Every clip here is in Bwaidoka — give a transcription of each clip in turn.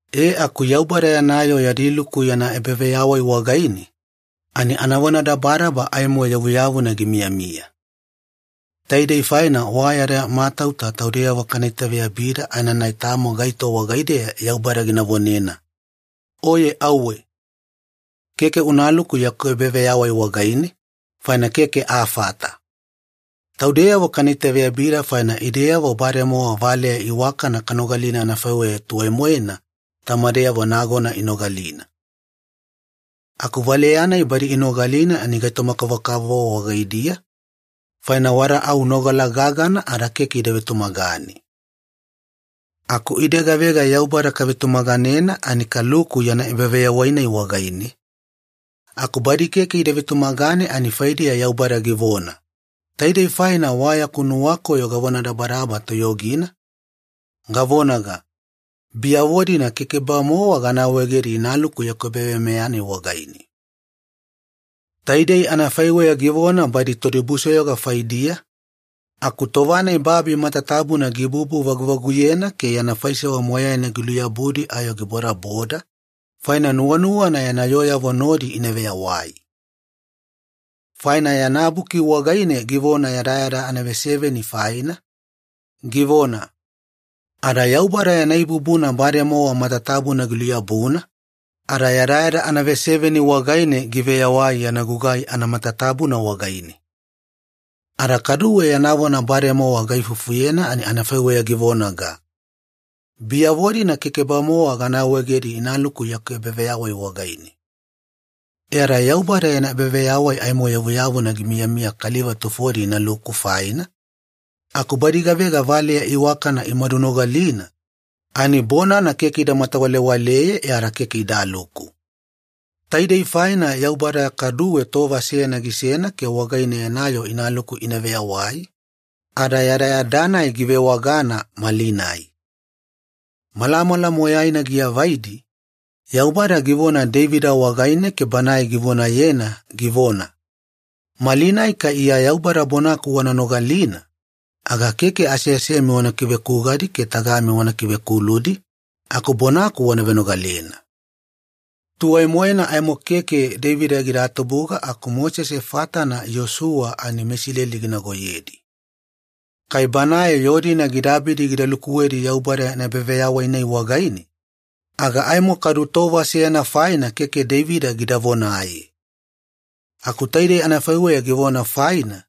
E aku Yaubada yana yoo yadi luku yana ebaveyawai wagaine, ani anavonadabadaba aimo yavuyavuna gimiyamiya. Taidei faina wa yada matauta taudeyavo kana itaveyabida aenanai tamo gaito wagaideya Yaubada gina vonena, “Oye auwe. Keke unaluku yaku ebaveyawai wagaine, faina keke afata.” Taudeyavo kana itaveyabida faina ideyavo bademowa valeya iwakana kanogalina anafaiweya tuwai-moena tamadeyavo nagona inogalina. Aku valeya-nai badi inogalina ani gaitoma-kavokavovo wagaidiya, faina wada au nogala gagana ada keke ida vetumagane. Aku ide gavega Yaubada kavetumaganena ani kaluku yana ebaveyawai-nai wagaine, aku badi keke ida vetumagane ani faidiya Yaubada givona, “Taidei faina wa yaku nuwakoyo gavonadabadaba toyogina, gavonaga, ‘Biyavo-dina keke-bamowa gana awaegedi inaluku yaku ebaveyawai-nai wagaine.’” Taidei anafaiweya givona badi todibusoyoga faidiya, aku tova-nai babi matatabuna gibubu-vaguvaguyena ke yana faisewa moyaina giluyabudi ayo gibodaboda, faina nuwanuwana yana yooyavo nodi ina veyawai. Faina yana buki wagaine givona yadayada anaveseveni faina, givona, “Ada Yaubada yana ibubuna bademowa matatabuna giluyabuna, ada yadayada anaveseveni wagaine giveyawai yana gugai anamatatabuna wagaine.” Ada kaduwe yana vona bademowa gaifufuyena ani anafaiweya givonaga, “Biyavo-dina keke-bamowa gana awaegedi inaluku yaku ebaveyawai wagaine.” E ada Yaubada yana ebaveyawai aimo yavuyavuna gimiyamiya kaliva tufodi inaluku faina, aku badi gavega valeya iwakana imadunogalina ani bonana keke ida matawalewaleye e ada keke idaluku. Taidei faina Yaubada kaduwe tova seyana gisena ke wagaine yana yoo inaluku ina veyawai, ada yadayada-nai givewagana ‘malinai’. Malamala moyaina giavaidi, Yaubada givona Deivida wagaine ke banae givonayena givona, “Malinai kai Iya Yaubada bonaku wana nogalina, aga keke aseasemi wana kivekugadi ke tagami wana ivekuludi, aku bonaku wana venogalena.” Tuwai-moena aimo keke Deivida gida tubuga aku Mosese fatana Iyosuwa ani meIsileli ginagoyedi. Kai banae yoo-dina gida abidi gida lukuwedi Yaubada yana ebaveyawai-nai wagaine, aga aimo kadu tova seyana faina keke Deivida gida vonaye. Aku taidei anafaiweya givona faina,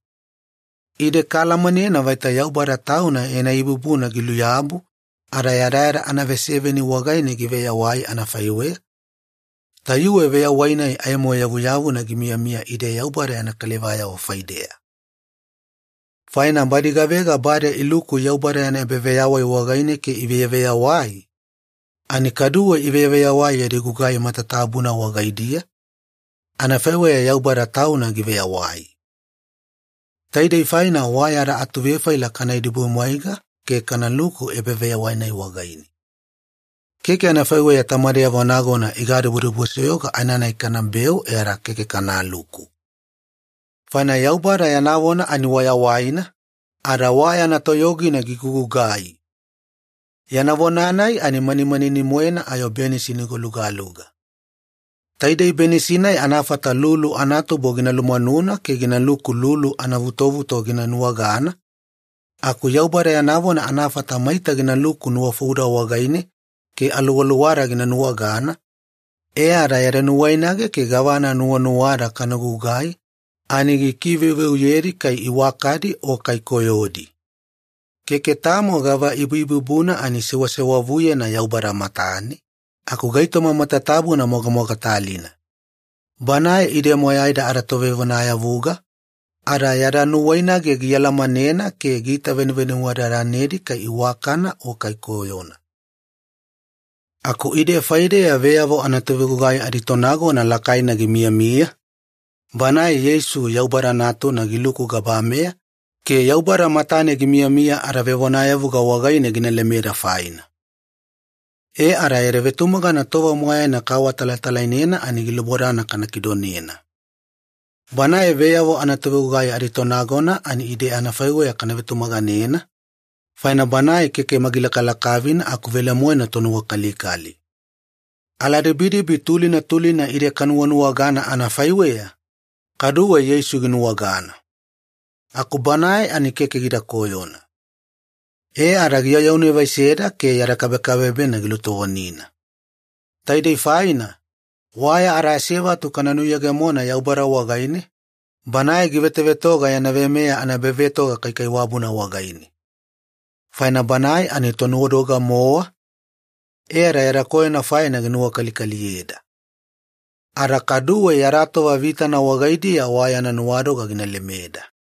ide kaalamanena vaita Yaubada Tauna yana ibubuna giluyabu ada yadayada anaveseveni wagaine giveyawai anafaiweya, tayuwe veyawai-nai aimo yavuyavuna gimiyamiya ide Yaubada yana kalivayavo faideya. Faina badi gavega bade iluku Yaubada yana ebaveyawai wagaine ke iveyaveyawai, ani kaduwe iveyaveyawai yadi gugai matatabuna wagaidiya, anafaiweya Yaubada Tauna giveyawai. Taidei faina wa yada atuvefaila kana idibudibumwaiga ke kanaluku ebaveyawai-nai wagaine. Keke anafaiweya tamadeyavo nagona igadibudibusoyoga, aenanai kanabeu e ada keke kanaluku. Faina Yaubada yana vona ani wa yawaina, ada wa yana toyogina gigugugai. Yana vona-nai ani manimanini-moena ayo benisi nigolugaluga. Taidei benisi-nai anafata lulu anatubo gina lumwanuna ke ginaluku lulu anavutovuto gina nuwagana, aku Yaubada yana vona anafata maita ginaluku nuwafouda wagaine ke aluwaluwada gina nuwagana, e ada yada nuwainage ke gavana nuwanuwada kana gugai ani gikiveuveuyedi kai iwakadi o kai koyodi. Keke tamo gava ibuibubuna ani sewasewavuyena Yaubada matane, aku gaitoma matatabuna mogamogatalina. Banae ide moyaida adaTovevonayavuga, ada yada nuwainage gialamanena ke giitavenuvenuwadadanedi kai iwakana o kai koyona. Aku ide faideya veyavo anatovegugai aditonagona lakaina gimiyamiya, Banae Yeisu Yaubada Natuna giluku gabameya ke Yaubada matane gimiyamiya adavevonayavuga wagaine gina lemeda faina. E ada yada vetumagana tova moyaina kaawatalatalainena ani gilubodana kana kidonena. Banae veyavo anatovegugai aditonagona ani ide adafaiweya kana vetumaganena, faina Banae keke magilakalakavina aku velemoena tonuwakalikali. Aladibidibi tulina tulina ide kanuwanuwagana anafaiweya, kaduwe Yeisu ginuwagana. Aku Banae ani keke gida koyona. E ada giayaunevaiseda ke yada kabekabebena gilutovonina. Taidei faina, wa yada asevatu kana nuyegemona Yaubada wagaine, Banae givetovetoga yana veimeya anaebavetoga kaikaiwabuna wagaine. Faina Banae ani Tonuwadoga-mowa, e ada yada koyona faina gina nuwakalikaliyeda. Ada kaduwe yada tova vitana wagaidiya wa yana nuwadoga gina lemeda.